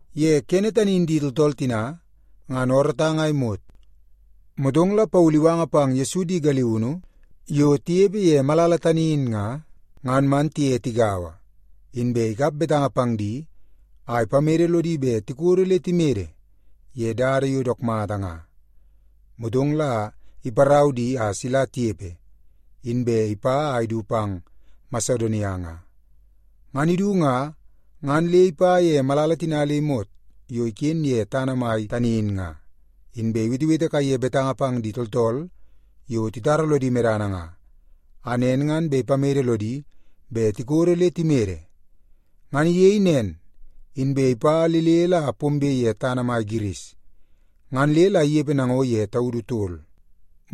Ye kene tani in di tooltool tina ngan oorootang a imot, motong la Paulu iwanga pang Yesu di galiunu yo tinepe ye malala tani in nga, ngan man tiye tigaua, inbe ikap betanga pang di a ipamede lodi bet tikodo le timede ye dada yo dook mata nga. Motong la iparau di a sila tinepe, inbe ipa a idu pang Masedonia nga. Ngan idu nga, ngan le ipa ye malala tina le imot yo iken ye tana mai tani in nga, inbe iwetewete kaiye betanga pang di tooltool yo titara lodi medana nga, a nen ngan bet ipamede lodi bet tikodo le timede. Ngan iyei nen, inbe ipa le le la pombe ye tana mai Giris, ngan le la inepe nango ye taudu tol.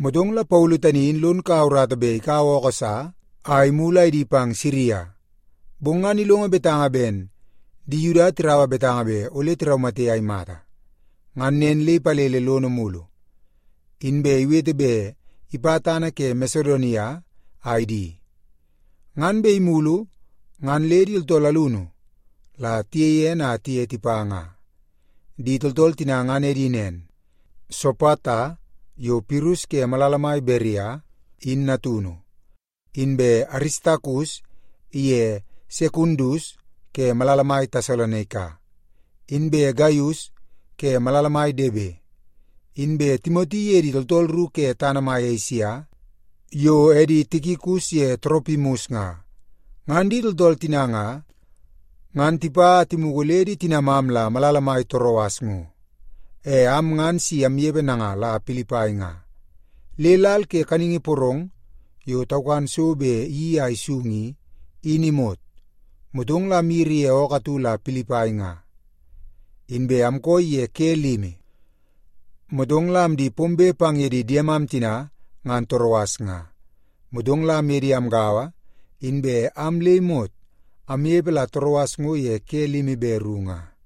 Motong la Paulu tani in lon kaua urata bet ikaua ookoo sa a imulu a idi pang Siria. Bong ngan ilongo betanga ben di Yuda tiraua betanga bet ole tiraumate a imata. Ngan nen le ipalele lono mulu, inbe iwete bet ipa tana ke Masedonia a idi. Ngan bet imulu ngan le di tooltool alunu la tiyei ene a tiye tipa nga. Di tooltool tina ngan edi nen: Sopata yo Pirus ke malala mai Beria, in natunu; inbe Aristakus iye Sekundus ke malala mai Tesalonaika; inbe Gaius ke malala mai Debe; inbe Timoti iye di tooltool ru ke tana mai Esia, yo edi Tikikus ye Toropimus nga. Ngan di tooltool tina nga, ngan tipa a timugu le di tinamam la malala mai Toroas ngo. E am ngan si amnepe nanga la Pilipai nga, le lal ke kaningi porong yo taukan so yo bet iyeii a isung i, in imot, motong la amyiri ye ookoo atu la Pilipai nga. Inbe amkooi ye ke limi, motong la amdi pombe pang ye di diemam tina ngan Toroas nga. Motong la amye di amgaua, inbe am le imot amnepe la Toroas ngo ye ke limi be ru nga.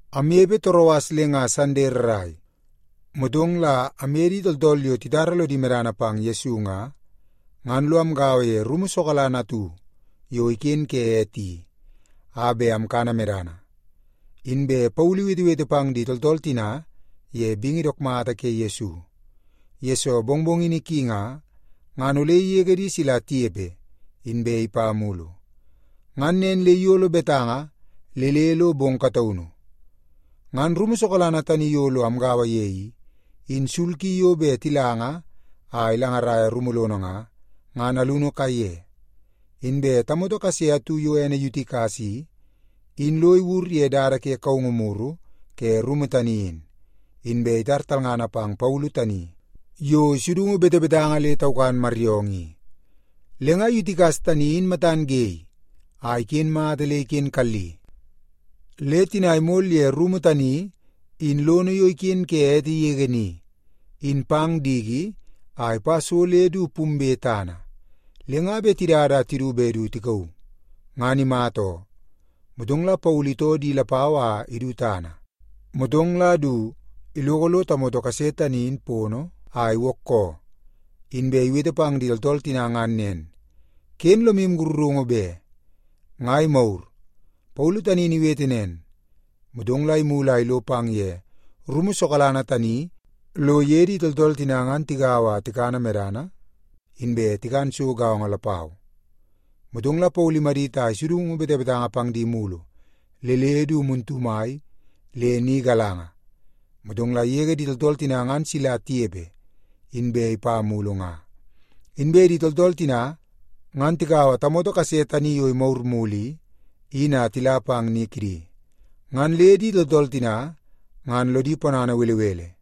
Amnepe Toroas le nga Sande rrai, motong la amye di tooltool yo titara lodi medana pang Yesu nga, ngan lo amgaua ye rumu sokalana atu yo iken ke ete i, a bet amkana medana. Inbe Paulu iwetewete pang di tooltool tina ye bingi dook mata ke Yesu, yesoo mongmongini ki nga, ngan ole igege di sila tinepe inbe ipa mulu. Ngan nen le iyolo betanga le le lo bong kataunu. Ngan rumu sokalana tani yo lo amgaua ye i, in sul ki yo bet tilanga a ilangaraia rumu lono nga, ngan alunu kaiye. Inbe tamoto kase atu yo ene Yutikas i, in lo iwur ye dada ke kaungu muru ke rumu tani in. Inbe itar talngana pang Paulu tani yo isudungu betebetanga le taukan maryoongoo i. Le nga Yutikas tani in matan ge a iken mata le iken kalli, le tina imol ye rumu tani in lono yo iken ke ete yege ni, in pang diki a ipa so le du pumbe tana, le nga bet tidada a tidu bet du tikauu, ngan imata oo. Motong la Paulu itoo di lapau a idu tana, motong la du iloko lo tamoto kase tani in pono a iwookoo. Inbe iwete pang di tooltool tina ngan nen, “Ken lomu sakarungu be. Nga imagur.” Paulu tani in iwete nen, motong la imulu a ilo pang ye rumu sokalana tani lo iye di tooltool tina ngan tigaua a tikana medana, inbe tikan so gaongo lapau. Motong la Paulu imadit a isudungu betebetanga pang di mulu le le du muntu mai le ni galanga, motong la igege di tooltool tina ngan sila tinepe, inbe ipa mulu nga. Inbe di tooltool tina ngan tikaua tamoto kase tani yo imagur mulu i, in a tila pang ni kidi. Ngan le di tooltool tina ngan lodi ponana belebele.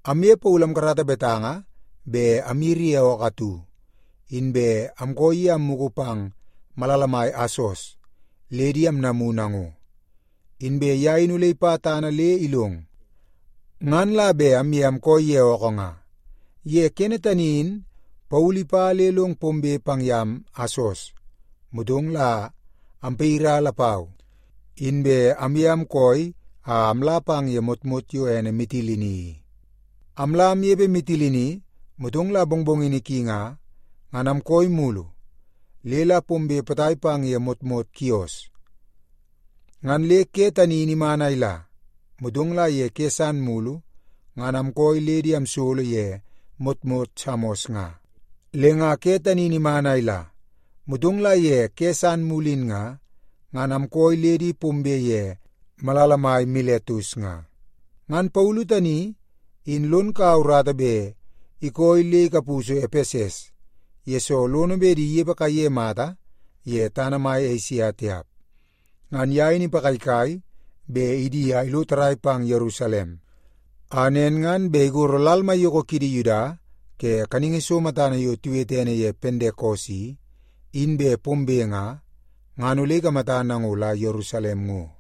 Amye Paulu amkarata betanga bet amyiri ye ookoo atu, inbe amkooi ye a ammugu pang malala mai Asos le di amnamu nango. Inbe ye in ole ipa tana le ilong, ngan la bet amye amkooi ye ookoo nga. Ye kene tani in Paulu ipa le long pombe pang yam Asos, motong la ampayira lapau, inbe amye amkooi a amla pang ye motmot yo ene Mitilini i. Amla amnepe Mitilini, motong la mongmongini ki nga, ngan amkooi mulu le la pombe potai pang ye motmot Kios. Ngan le ke tani in iman a ila, motong la ye ke san mulu ngan amkooi le di amsolo ye motmot Samos nga. Le nga ke tani in iman a ila, motong la ye ke san mulu in nga, ngan amkooi le di pombe ye malala mai Miletus nga. Ngan Paulu tani in lon kaua urata bet ikooi le ikapusu Epeses, yesoo lono bet di inepe kaiye mata ye tana mai Esia tiap. Ngan ye in ipagaigai bet idi a ilo tarrai pang Yerusalem, a nen ngan bet igoro lal maiyoko kidi Yuda ke kaningi so matana yo tiwete ene ye Pentekos i, in bet pombe nga, ngan ole ikamata nango la Yerusalem ngo.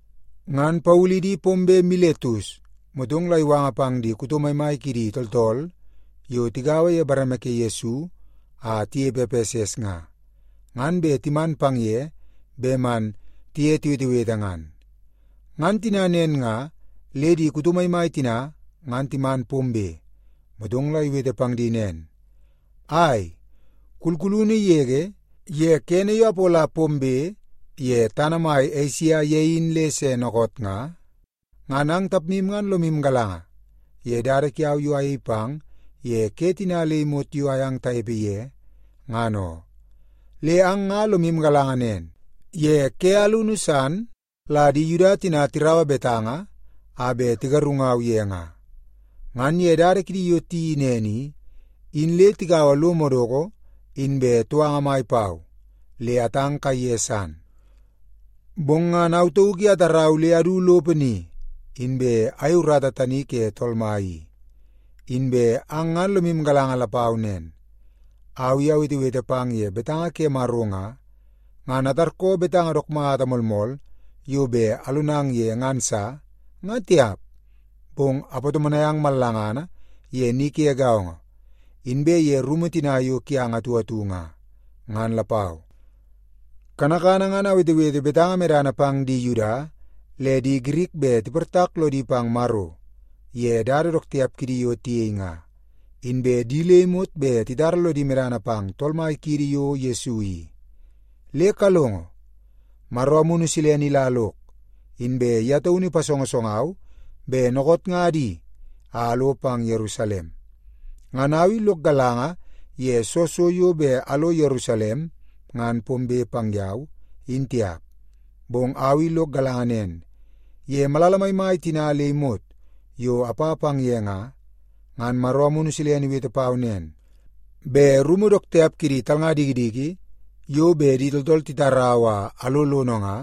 Ngan Paulu idi pombe Miletus, motong la iwanga pang di kuto maimai kidi tooltool yo tigaua ye bareme ke Yesu a tinepe Epeses nga, ngan bet timan pang ye bet man tiye tiwetewete ngan. Ngan tina nen nga, le di kuto maimai tina ngan timan pombe, motong la iwete pang di nen, “Ai, kulkulunu yege, ye kene yo apola pombe ye tana mai Esia ye in le se dookoot nga, ngan ang tapmu ngan lomu galanga ye dada kiau yo ayei pang ye ke tina le imot yo ayang tanepe ye, ngan oo. Le ang nga lomu galanga nen, ye ke alunu san la di Yuda tina tiraua betanga a bet tigarungau ye nga. Ngan ye dada kidi yo tiyeii nen i, in le tikaua lo madoko inbe touanga mai pau le atang kaiye san. Bong ngan au tauk i atarau le adu lopo ni, inbe ayei urata tani ke Tool Mai i. Inbe ang ngan lomu galanga lapau nen, au i awetewete pang ye betanga ke Maro nga, ngan atarkoo betanga dook mata moolmool yo bet alonang ye ngan sa, nga tiap. Bong apatomonai ang mallangana ye ni ke gaongo, inbe ye rumu tina yo kiang atu atu nga, ngan lapau. Kanakana ngan awetewete betanga medana pang di Yuda le di Girik bet tiportak lodi pang Maro ye dada dook tiap kidi yo tiyei nga, inbe di le imot bet titara lodi medana pang Tool Mai kiidi yo Yesu i. “Le kalongo. Maro Amunu Silene ila lok, inbe ye taunu ipasongosongau bet dookoot nga adi a alo pang Yerusalem. Ngan au i lok galanga ye soo so yo bet alo Yerusalem ngan pombe pang yau, in tiap. Bong au i lok galanga nen, ye malala maimai tina le imot yo apa pang ye nga, ngan Maro Amunu Silene iwete pau nen, bet rumu dook tiap kidi talnga dikidiki yo bet di tooltool titarau a alo lono nga,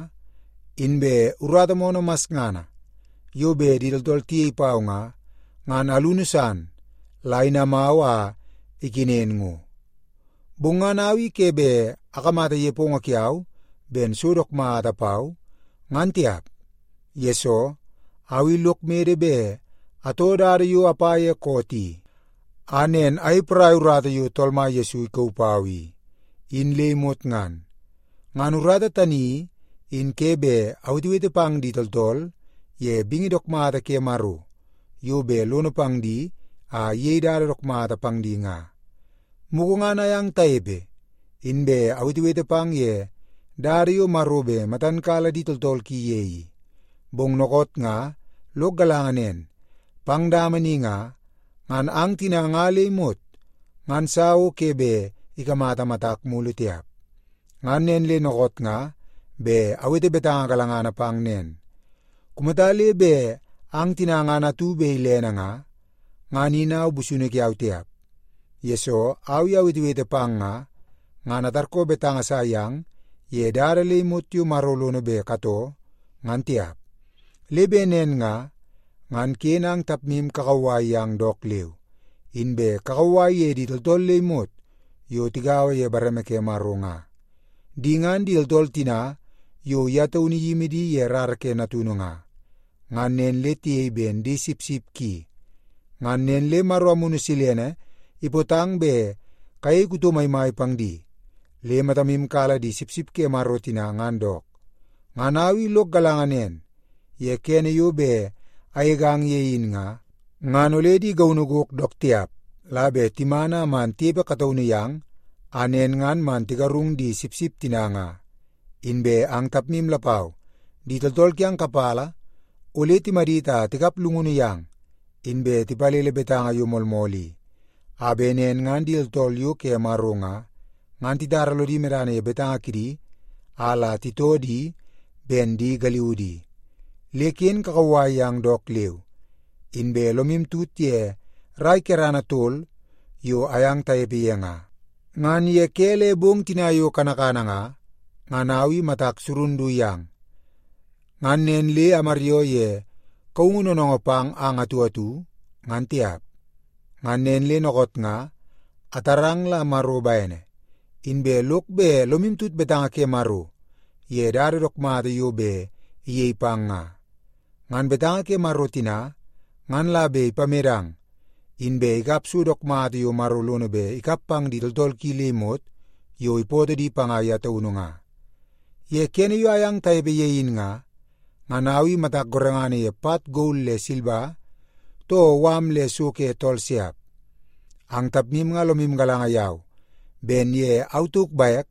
inbe urata moonoo masngana yo bet di tooltool tiyei pau nga, ngan alunu san la inamau a ikenen ngo. Bong ngan au i ke bet akamata nepongo kiau ben so dook mata pau, ngan tiap. Yesoo, au i lok mede bet atoo dada yo apa ye koot i, a nen ayei poraia urata yo Tool Mai Yesu ikauu pau i, in le imot ngan. Ngan urata tani i, in ke bet awetewete pang di tooltool ye bingi dook mata ke Maro yo bet lono pang di a iyei dada dook mata pang di nga. “Mugu ngan ayang tanepe, inbe awetewete pang ye dada yo Maro bet matan kala di tooltool ki ye i. Bong dookoot nga lok galanga nen, pang dama ni nga, ngan ang tina nga le imot ngan sa o ke bet ikamata matak mulu tiap. Ngan nen le dookoot nga bet awete betanga galangana pang nen. Kumata le bet ang tina ngan atu bet ilene nga, ngan in au busunu kiau tiap, yesoo au i awetewete pang nga, ngan atarkoo betanga sa yang ye dada le imot yo Maro lono bet katoo, ngan tiap. Le bet nen nga, ngan ken ang tapmu kakauwai yang dook leu, inbe kakauwai ye di tooltool le imot yo tigaua ye bareme ke Maro nga. Di ngan di tooltool tina yo ye taunu iyimi di ye rara ke Natunu nga, ngan nen le tiyei ben di sipsip ki. Ngan nen le Maro Amunu Silene ipootang bet kayei kuto maimai pang di, le matamu kala di sipsip ke Maro tina ngan dook. Ngan au i lok galanga nen, ye kene yo bet agegang ye in nga, ngan ole di gaunu gok dook tiap la bet timan a man tinepe kataunu yang, a nen ngan man tigarung di sipsip tina nga. Inbe ang tapmu lapau, di tooltool kiang kapala ole timadit a tikap llungunu yang, inbe tipalele betanga yo moolmool i, a bet nen ngan di tooltool yo ke Maro nga, ngan titara lodi medana ye betanga kidi a la titoo di ben di galiudi. Le ken kakauwai yang dook leu! Inbe lomu tut ye rai kerana tol yo ayang tanepe ye nga, ngan ye ke le bong tina yo kanakana nga, ngan au i matak surun du yang, ngan nen le amaryoo ye kaungu noonoongoo pang ang atu atu, ngan tiap. “Ngan nen le dookoot nga, atarang la Maro bene, inbe lok bet lomu tut betanga ke Maro ye dada dook mata yo bet iyei pang nga. Ngan betanga ke Maro tina ngan la bet ipamedang, inbe ikap so dook mata yo Maro lono bet ikap pang di tooltool ki le imot yo ipootoo di panga ye taunu nga. Ye kene yo ayang tanepe ye in nga, ngan au i matak gorengana ye pat gol le silba, too mala le so ke tool siap. Ang tapmu nga lomu galanga yau ben ye au tauk bek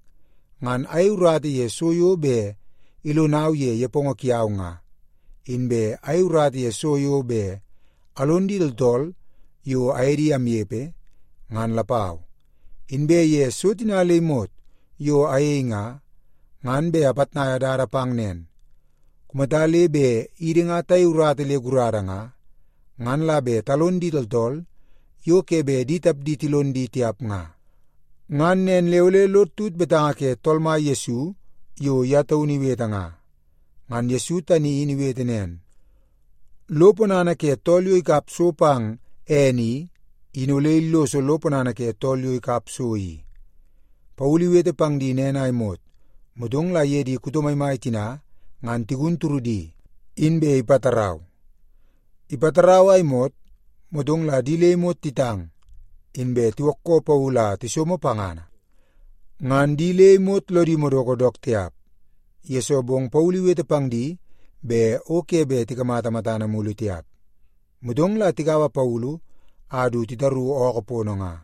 ngan ayei urata ye so yo bet ilonau ye nepongo kiau nga, inbe ayei urata ye so yo bet alon di tooltool yo aye di amnepe, ngan lapau. Inbe ye so tina le imot yo ayei nga, ngan bet apitnaia dada pang nen; kumata le bet idi nga tayei urata le gurada nga, ngan la bet talon di tooltool yo ke bet di tapdi tilon di tiap nga. Ngan nen le ole lod tut betanga ke Tool Mai Yesu yo ye taunu iwete nga. Ngan Yesu tani in iwete nen, ‘Lo ponana ke tool yo ikap so pang ene i, in ole illoso lo ponana ke tool yo ikap so i.’” Paulu iwete pang di nen a imot, motong la iye di kuto maimai tina ngan tigun turudi, inbe ipatarau. Ipatarau a imot, motong la di le imot titang, inbe tiwookoo Paulu a tisomo pangana. Ngan di le imot lodi madoko dook tiap, yesoo bong Paulu iwete pang di bet o ke bet tikamata matana mulu tiap. Motong la tikaua Paulu a du titaru ookoo pono nga.